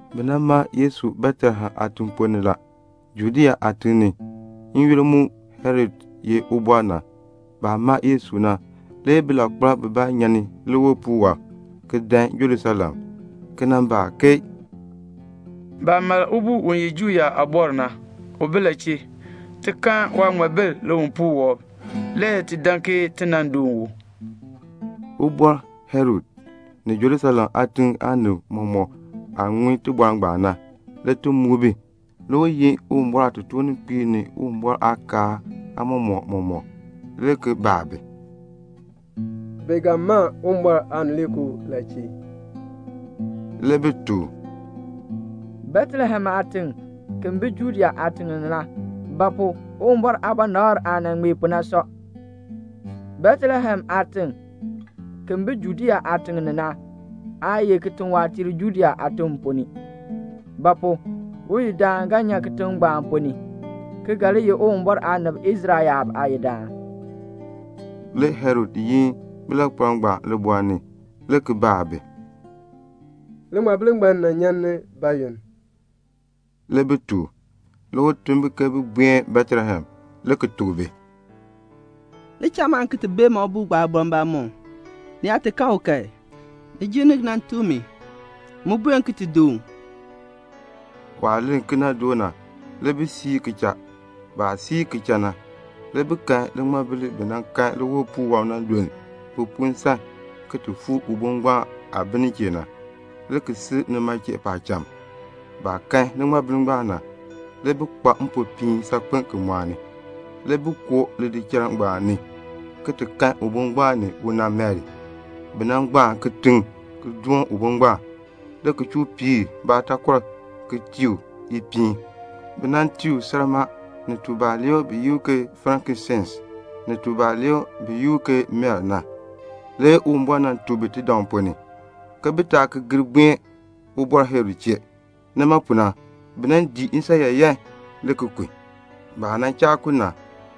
Bi ma Yesu Betlehem aatiŋ ponn ni la, Judea aatiŋ ni, n-yoonn mu Herod ye ubɔr na. Baah ma Yesu na le bilankpalb bibaa nyan ni liwipuul wɔb le ki dan Jerusalem, le ki baa ke "Baah ma ubo u ye Juu yaab aabɔr na, u bi la chee? Ti kan waaŋmabil liwipuul wɔb, le ti dan ke ti nan doon u." Ubɔr Herod, ni Jerusalem aatiŋ aanib mɔmɔk, baah ŋun tibɔr ngbaan na, le ti muk bi. Le u yin Uwumbɔr aatotoorninkpiib ni Uwumbɔr aakaal aamɔmɔkb mɔmɔk, le ki baa bi, "Bi ga ma Uwumbɔr Aanileekoo Kristo la chee?" Le bi tuk u, "Betlehem aatiŋ, ki bi Judea aatiŋ ni na; ba pu? Uwumbɔr aabɔnabr aah nan ŋmee pu na sɔ: 'Betlehem aatiŋ, ki bi Judea aatiŋ ni na, aa ye kitiwaatiir Judea aatim ponn ni; ba pu? uyidaan ga nyan kitiŋ ngbaan ponn ni, ki ga li ye Uwumbɔr aanib Israel yaab aayidaan."' Le Herod yin bilankpalb ngbaan libɔɔl ni, le ki baa bi, "Liŋmabil ngbaan nan nyan ni bayoonn?" Le bi tuk u. Le u tun bi ke bin buen Betlehem le ki tuk bi, "Li cha man ki ti bee ubo ngbaan aabɔr mbamɔm. Ni yaa kan u kan, ni gir ni ki nan tuk mi, m mu buen ki ti doon u." Waah len kena doo na le bi siir le ki cha. Baah siir ki cha na, le bi kan liŋmabil li bi nan kan liwipuul wɔb na le luln bi pu nsan ki ti fuu ubo ngbaan aah bi nin chee na, le ki sil nima chee paacham. Baah kan liŋmabil ngbaan na, le bi kpa mpopiin saakpen le ki mɔɔni. Le bi koo lidichal ngbaan ni, le ki ti kan ubo ngbaan ni una Mari. Bi nan gbaan kitiŋ ki doon ubo ngbaan, le ki chuu piir baataakɔr mam, le ki tii u ipiin. Bi tii u salmaa, ni tubalee bi yi u ke frankinsense, ni tubalee bi yi u ke mir. Le Uwumbɔr nan tuk bi tidaŋ ponn ni, ke bi taa ki gir buen ubɔr Herod chee. Nima pu na le bi ki dii nsan yaayan ki kun. Le baah cha kun na,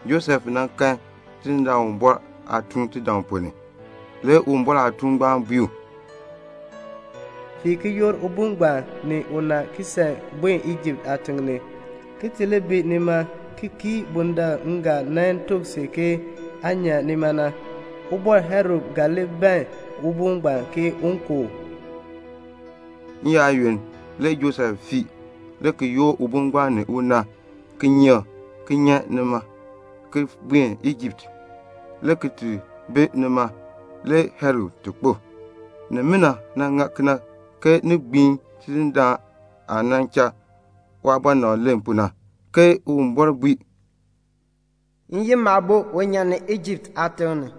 Josef kan Tidindaan Uwumbɔr aatuun tidaŋ ponn ni. Le Uwumbɔr aatuun ngbaan bui u, "Fiin ki yoor ubo ngbaan ni una ki san ki buen Ijipt aatiŋ ni, ki li bi nima ki kii bundaln m ga nan tuk si ke aa nyan nima na. Ubɔr Herod ga li ban ubo ngbaan ke un ku u." N-yaayoonn le Josef fii le ki yoor ubo ngbaan ni una kinyeek ki nyan nima le ki buen Ijipt, le ki ti bi nima le Herod ti kpo. Nimina ŋa kena ke ni gbiin Tidindaan Uwumbɔr aah nan cha waabɔnabr len pu na, ke Uwumbɔr bui, "M yin Maabo un nyan ni Ijipt aatiŋ ni."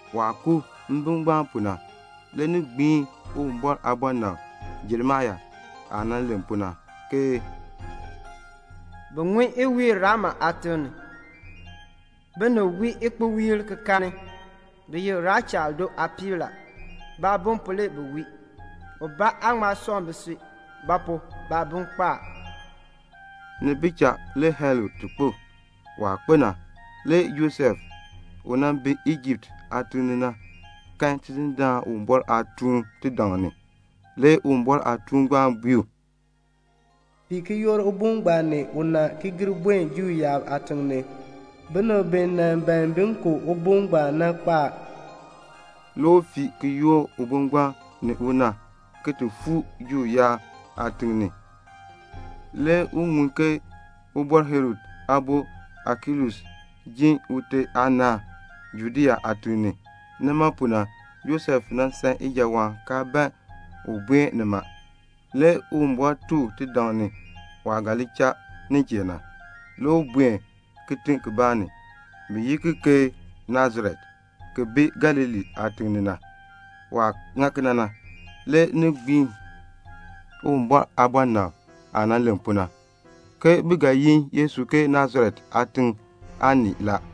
Waah ku mbim ngbaan pu na, le ni gbiin Uwumbɔr aabɔnabr Jeremia aah nan len pu na, ke "Bi ŋun iwiil Rama aatiŋ ni, binib wii ikpowiil ki kaani. Bi ye Rechal do aapiib. Baabim pu le bi wii. Ubaa aan ŋma sɔŋ bisui; ba pu? baabim kpo a." Ni bi cha le Herod ti kpo. Waah kpo na, le Josef, u bi Ijipt aatiŋ ni na, kan Tidindaan Uwumbɔr aatuun tidaŋ ni. Le Uwumbɔr aatuun ngbaan bui u, "Fiin ki yoor ubo ngbaan ni una ki gir buen Juu yaab aatiŋ ni. Binib bi nan ban bin ku ubo ngbaan na, bi kpo a." Le u fii ki yoor ubo ngbaan ni una, ki ti fuu Juu yaab aatiŋ ni. Le u ŋun ke Ubɔr Herod aabo Akelaus jin ute aanaan Judea aatiŋ ni. Nima pu na, le Josef san ijawaan, kaa ban un buen nima. Le Uwumbɔr tuk u tidaŋ ni waah ga li cha nin chee na. Le u buen kitiŋ kibaa ni, bi yi ki ke Nasaret, ki bi Galilee aatiŋ ni na. Waah ŋa kena na, le ni gbiin Uwumbɔr aabɔnabtiib aah nan len pu na, ke bi ga yi Yesu ke Nasaret aatiŋ aanii la.